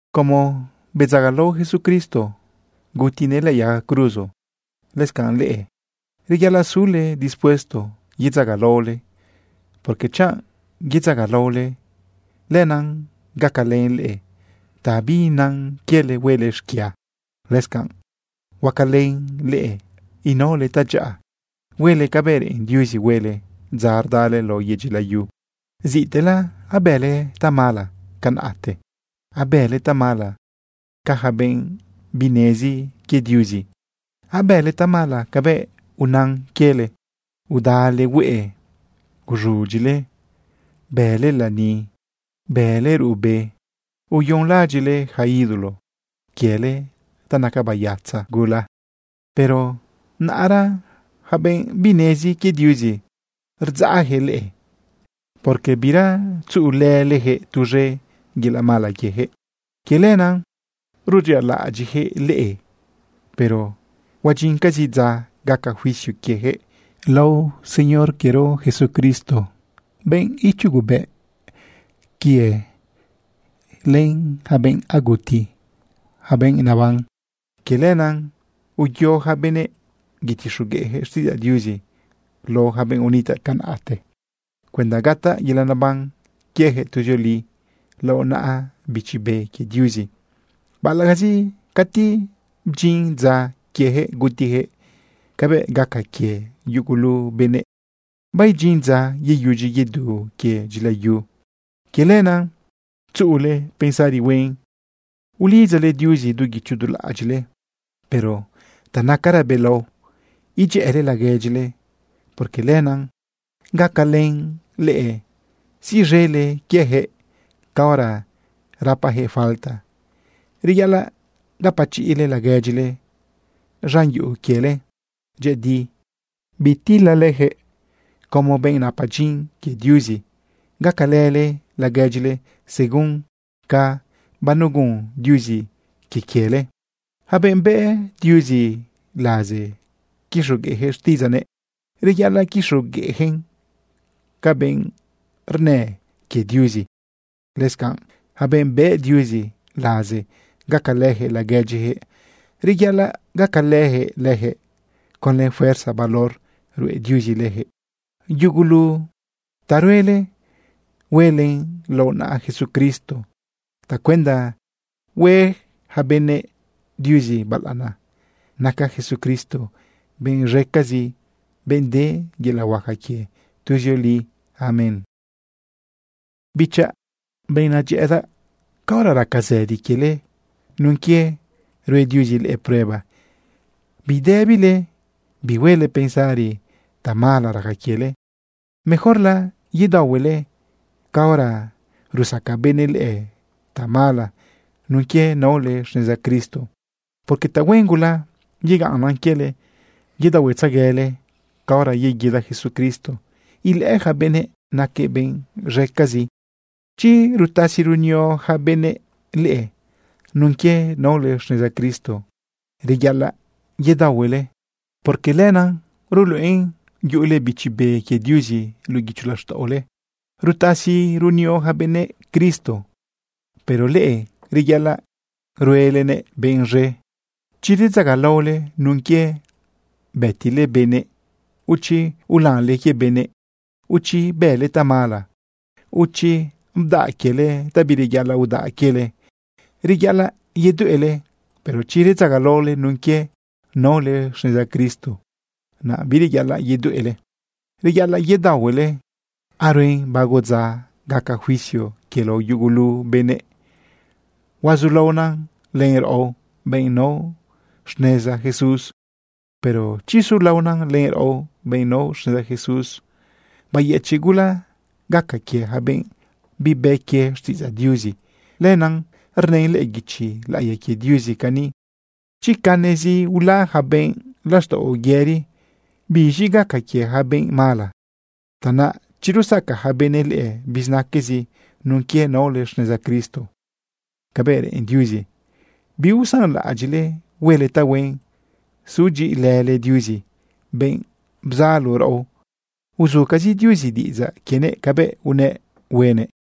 Como bedzagalao Jesucristo, gutinëꞌ lëꞌë yaga cruzo, lëscanꞌ leꞌe, reyaꞌalaꞌ sule dispuesto yedzagalaole. Porque chanꞌ yedzagalaole, lenaꞌ gacalën leꞌe ta biinan quiele huele xquia. Lëscanꞌ huacalën leꞌe inaole tadyaꞌa huele cabëꞌ reꞌen Diuzi huele dza rdale lao yedyi layu. Ziꞌtela abële tamala canaꞌte. Abële tamala ca yaca benꞌ binezi quie Diuzi. Abële tamala cabëꞌ unan quiele. Udale hueꞌe, uz̃udyile, bële lani, bële ruꞌbe, uyonlaꞌadyiꞌle yaca ídolo quiele ta naca bayatza gula. Pero naꞌra yaca benꞌ binezi quie Diuzi rdzaꞌjëꞌ leꞌe, porque bira tzuꞌulëlejëꞌ tuz̃e yelaꞌ mala quiejëꞌ. Quie lenaꞌ rudyialaꞌadyiꞌjëꞌ leꞌe. Pero huadyincazi dza gaca juicio quiejëꞌ lao Señor quiero Jesucristo, benꞌ ichugubëꞌ quie len yaca benꞌ aguti, yaca benꞌ naban. Quie lenaꞌ uyo yaca benëꞌ yetixogueꞌjëꞌ xtiꞌidzaꞌ Diuzi lao yaca benꞌ unitaꞌ tiempote cuenda gataꞌ yelaꞌ neban quiejëꞌ tuzioli lao naꞌa Bichi Be quie Diuzi, baꞌalaꞌcazi cati bdyin dza quiejëꞌ gutiyaquëꞌ cabëꞌ gaca quie yugulu benëꞌ. Baidyin dza yeyudyi yedu quie dyila yu. Quie lenaꞌ tzuꞌule pensari huen ulidzale Diuzi du guicho du laꞌadyiꞌle. Pero ta nacara belao idyëꞌële laguedyile, porque lenaꞌ gacalën leꞌe siꞌz̃ele quiejëꞌ caora rapajëꞌ falta. Reyaꞌalaꞌ gapachiꞌle laguedyile z̃an yuꞌu quiele dyëꞌëdi, bitilale leyaquëꞌ. Como benꞌ napa dyin quie Diuzi, gacalële laguedyile según ca banegun Diuzi quie quiele. Yaca benꞌ bëꞌ Diuzi laze quixogueꞌjëꞌ xtiꞌidzaꞌnëꞌ, reyaꞌalaꞌ quixogueꞌjëꞌn ca benꞌ rnë quie Diuzi. Lëscanꞌ, yaca benꞌ bëꞌ Diuzi laze gacalëjëꞌ laguedyijëꞌ, reyaꞌalaꞌ gacalëjëꞌ lëjëꞌ conlë fuerza valor ruꞌe Diuzi lëjëꞌ. Yugulu ta ruele, huelen lao naꞌa Jesucristo tacuenda hue yaca benëꞌ Diuzi balaꞌana. Naca Jesucristo benꞌ z̃ecazi, benꞌ de yelaꞌ huaca quie tuzioli. Amén. Bichaꞌ, benꞌ nadyëꞌëdaꞌ, caora raca zëdi quiele nun quie rue Diuzi leꞌe prueba, bidëbile bihuele pensari tamala raca quiele. Mejorla yedaohuele caora rusaca benëꞌ leꞌe tamala nun quie naole xneza Cristo, porque tahuen gula yegaꞌnnan quiele yedaohuetzeguele caora yeguida Jesucristo ilëꞌë yaca benëꞌ naquëꞌ benꞌ z̃ecazi. Chi rutasi runio yaca benëꞌ leꞌe nun quie naole xneza Cristo, reyaꞌalaꞌ yedaohuele, porque lenaꞌ ruluꞌen yuꞌule Bichi Be quie Diuzi luꞌu guicho laxtaꞌole. Rutasi runio yaca benëꞌ Cristo, pero leꞌe reyaꞌalaꞌ ruelenëꞌ benꞌ z̃e. Chi redzagalaole nun quie bëtile benëꞌ, o chi ulanle quie benëꞌ, o chi bële tamala, o chi bdaꞌ quiele ta bireyaꞌalaꞌ udaꞌ quiele, reyaꞌalaꞌ yedueꞌle. Pero chi redzagalaole nun quie naole xneza Cristo, naꞌ bireyaꞌalaꞌ yedueꞌle, reyaꞌalaꞌ yedaohuele. Aruen bago dza gaca juicio quie lao yugulu benëꞌ. Huazulaona len raꞌo, benꞌ nao xneza Jesús. Pero chi sulaona len raꞌo, benꞌ nao xneza Jesús, bayëchiꞌ gula gaca quie yaca benꞌ bibë quie xtiꞌidzaꞌ Diuzi. Lenaꞌ rnën lëꞌë guichi laꞌiya quie Diuzi cani: Chi canezi ula yaca benꞌ laxtaꞌo yëri, ¿biz̃i gaca quie yaca benꞌ mala? Tanaꞌ, chi rusaca yaca benëꞌ leꞌe bizinaque nun quie naole xneza Cristo cabëꞌ reꞌen Diuzi, biusanlaꞌadyiꞌle huele tahuen sudyiꞌilële Diuzi, benꞌ bzalo raꞌo. Uzucazi Diuzi diꞌidzaꞌ quienëꞌ cabëꞌ unëꞌ huenëꞌ.